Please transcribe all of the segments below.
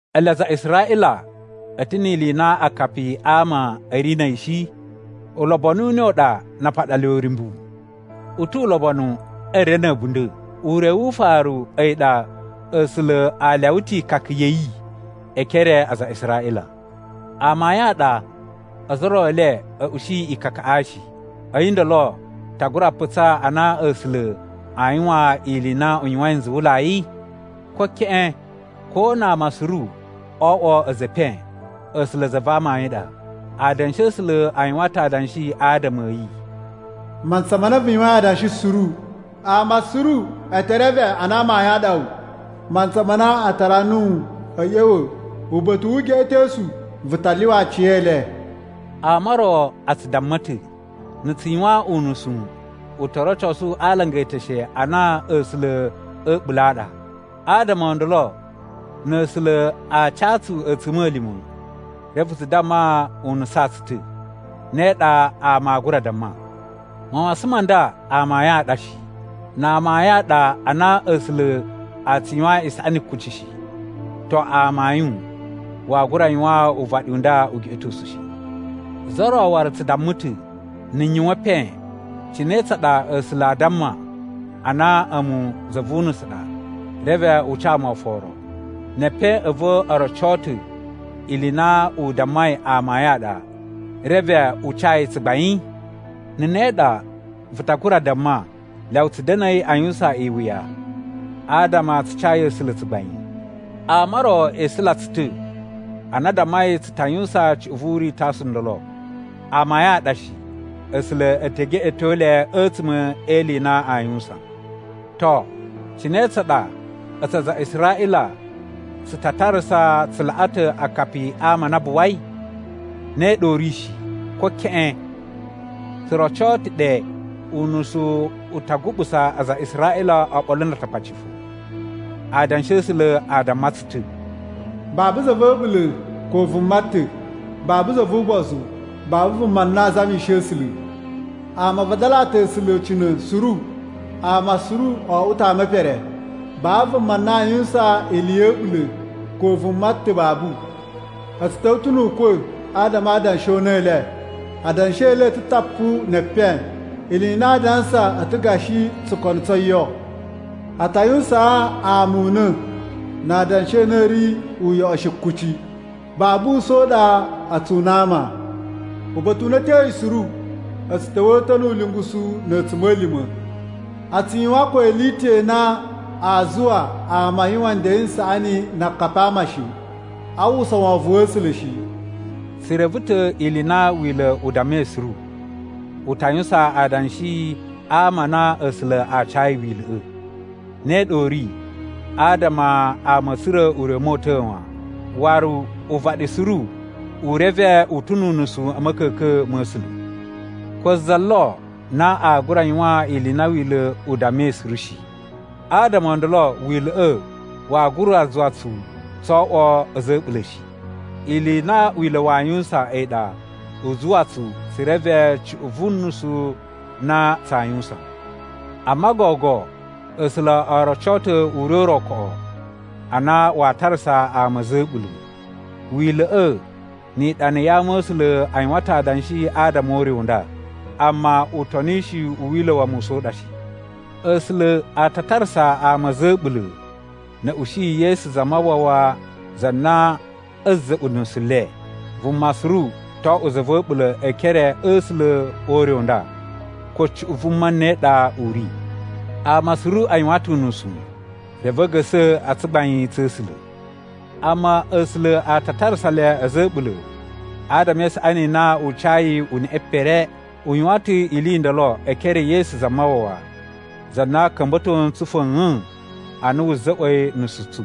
Ele aza a Israꞌila a̱ ta̱ ni ili i na akapi a ama a̱ ri na̱ a̱yi shi? Ulobonu u ne u ɗa na a paɗa le uryumbu? U tu ulobonu e re na̱ a̱bunda̱! Ure wu ufaru a̱yi ɗa A̱sula̱ a lyawa ta̱ ikaka ya̱ yi e ekere a aza a Israꞌila. Amayun a ɗa ozo o ro e le a̱ usu ikakaꞌa shi. A̱yi ndolo ta gura putsaa a na A̱sula̱ a yuwan ili i na u yuwain nzuwulai? Ko keꞌen! Ko na ama suru oo oꞌwo a̱za̱ e epen, A̱sula̱ za va amayun ɗa. Adanshi a̱ A̱sula̱ a yuwan ta̱ adanshi adama a̱ yi, “Mantsa ma na vu yuwain adanshi suru, ama suru e te reve a na amayun a ɗa wu. Mantsa ma na a tara nuwu a̱ ꞌya̱wa̱ uba̱ta̱ wu ugeꞌetosu, vu ta lyuwa aci e le.” Ama o ro a tsu damma ta̱, “Na̱ tsu yuwan unusu, u to rocosu a alanga e eteshe a na A̱sula̱ a̱ a̱ɓula̱ a ɗa. Adama o ndolo na̱ A̱sula̱ a ca tsu a̱tsuma̱lima̱ reve tsu damma u nusaan tsu ta̱.” (Ne ɗa ama aa gura damma.) Mawasan ma nda amayun a ɗa shi! Na amayun a ɗa a na A̱sula̱ a tsu yuwan isaꞌani kuci shi, to, amayun waa gura yuwaan uvaɗi u nda ugeꞌetosu shi. Za ro waru tsu damma ta̱, “Na̱ n yuwan epen, cine tsa ɗa A̱sula̱ a damma a na a̱mu za vu unusu u ɗa reve u ca mu oforo, ne epen a̱ va̱ o roco ta̱ ili i na u dammai amayun a ɗa reve u ca yi tsugbain?” Na̱ ne ɗa, vu ta gura damma, “Lyawa tsu da̱na̱i a yuwusan iwuya adama tsu cayi A̱sula̱ tsugbain.” Ama o ro e isula tsu ta̱ ana a dammai tsu ta yuwusan cuꞌun vu uritosu u ndolo. Amayun a ɗa shi! A̱sula̱ e te geꞌeto le a̱tsuma̱ e ili i na aa yuwusan. To, cine tsa ɗa a̱tsu aza a Israꞌila, tsu ta tarasa tsu laꞌa ta̱ akapi a ama a na a buwai? Ne ɗa u ri shi, ko keꞌen! Tsu roco ta̱ ɗe unusu u ta guɓusa aza a Israꞌila oɓolo na Atakpaci fo. Adanshi a̱ A̱sula̱ a damma tsu ta̱, “Babu za va̱ a̱ɓula̱. Ko vuma ta̱. Babu za vu ugbozu. Babu vuma na a zamishi A̱sula̱. Ama a vadalaa ta̱ A̱sula̱ ucina̱ suru. Ama suru o oꞌwo ta̱ ama e pere. Babu vuma na aa yuwusan ili ya̱ a̱ɓula̱. Ko vuma ta̱ babu.” “A̱ tsu ta̱wa̱ ta̱ nu ukwa̱ adama a adanshi o una̱ u le. Adanshi e le a̱ ta̱ tapu ne epen.” “Ili i na aa dansa a̱ ta̱ gashi tsukono tso yo.” “A ta yuwusaan ama una̱ na adanshi a na a̱ ri uyoꞌo shi kuci.” “Babu usa̱n u ɗa a tsu una ama. Uba̱ta̱ u na a̱ tyoyi suru a̱ tsu ta̱wa̱a̱ ta̱ nu ulungusu na̱ a̱tsuma̱lima̱. A tsu yuwan ko ili i ta̱ i na aa zuwa ama a yuwan nden n saꞌani na akapi a ama shi.” “A uwwusa wovon wa̱ A̱sula̱ shi.” Tsu reve ta̱ ili i na Wila̱ u dammai suru, u ta yuwusan adanshi a ama a na A̱sula̱ a cayi Wila̱ꞌa̱. Ne ɗa u ri adama ama a̱ tsura̱ ure u mota̱a̱ wan, waru uvaɗi suru u reve u ta̱ nu unusu a̱ ma̱ka̱ka̱n ma̱ A̱sula̱. Ko za lo na a gura yuwan ili i na Wila̱ u dammai suru shi, adama o ndolo Wila̱ꞌa̱ waa gura zuwa tsu tso oꞌwo a̱za̱ a̱ a̱ɓula̱ shi. Ili i na Wila̱ waa yuwusan a̱yi ɗa u zuwa tsu tsu reve cuꞌun vu nusu na tsaa yuwusan. Amma gogo A̱sula̱ o roco ta̱ ure u ro koꞌo a na waa tarasa ama a̱za̱ a̱ a̱ɓula̱. Wila̱ꞌa̱ ni iɗana ya Ama̱sula̱ a yuwan ta̱ adanshi adama o ure u nda, amma utonishi u Wila̱ wa Musa u ɗa shi. A̱sula̱ a ta tarasa ama a̱za̱ a̱ a̱ɓula̱ na̱ a̱ ushi Yesu Zamawawa za na a̱a̱ za̱ꞌwa̱ nusu le. Vuma suru to oꞌwo za va̱ a̱ɓula̱ e ekere a̱ A̱sula̱ o ure u nda, ko cuꞌun vuma ne ɗa u ri. Ama suru a yuwan ta̱ unusu reve a̱ ga̱sa̱ a tsugbain tsa̱ A̱sula̱. Amma A̱sula̱ a ta tarasa le a̱za̱ a̱ a̱ɓula̱ adama e isaꞌani i na u cayi uneꞌe pere. U yuwan ta̱ ili i ndolo e ekere e Yesu Zamawawa, za na ka̱mba̱to ntsu fa̱a̱n ana wu za̱ꞌwa̱i nusu tsu.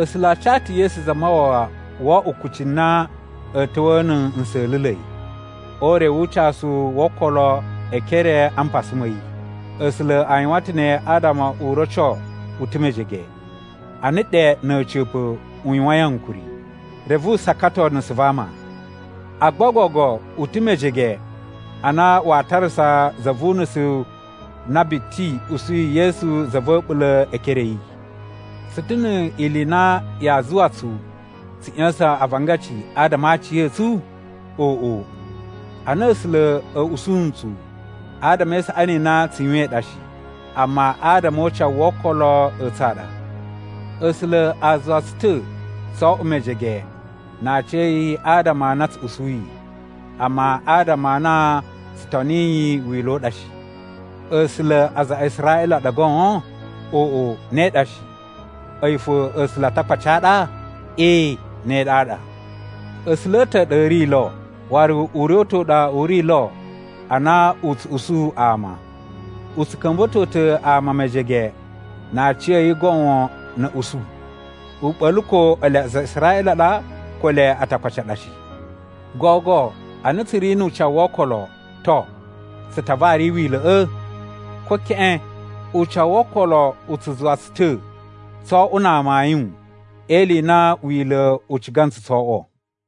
A̱sula̱ a ca ta̱ Yesu Zamawawa wo oꞌwo kucci na a̱ ta̱wa̱a̱ na̱ nsa̱la̱la̱i, o ure wu ucasu wo okolo e ekere a mpasa ma̱ yi. A̱sula̱ a yuwan ta̱ ne adama u roco u ta̱ mejege, ana ɗe na̱ a̱ca̱pa̱ u yuwain ankuri, reve u sakato nusu va ama. Agba gogo u ta̱ mejege ana waa tarasa za vu unusu na biti usuyi Yesu za va̱ a̱ɓula̱ e ekere a̱ yi. Tsu ta̱ ni ili i na yaa zuwa tsu tsu ꞌya̱sa̱n avangaci adama a aciya̱tsu? Oꞌo, ana A̱sula̱ a̱ usu ntsu, adama e isaꞌani i na tsu yuwain ɗa shi. Amma adama o ucawu wo okolo a̱ tsu a ɗa. A̱sula̱ a zuwa tsu ta̱ tso oꞌwo mejege na aciya̱yi adama a na tsu usuyi, amma adama a na tsu toniyi Wila̱ u ɗa shi. A̱sula̱ a aza a Israꞌila a ɗa goon? Oꞌo, ne ɗa shi! A̱yi fo A̱sula̱ a Atakpaci a ɗa? Ee, ne ɗaɗa! A̱sula̱ a̱ ta̱ a ɗa a̱ ri lo, waru ure u ta̱ u ɗa u ri lo a na u tsu usu ama. U tsu ka̱mba̱to ta̱ ama mejege na aciya̱yi goon na̱ a̱ usu. U ɓa̱la̱ ko ele aza a Israꞌila a ɗa ko ele Atakpaci a ɗa shi. Gogo a na tsu ri nu ucawu wo okolo, to, tsu ta vari Wila̱ꞌa̱? Ko keꞌen! Ucawu wo okolo u tsu zuwa tsu ta̱ tso oꞌwo na amayun e ili i na Wila̱ u ciga ntsu tso oꞌwo.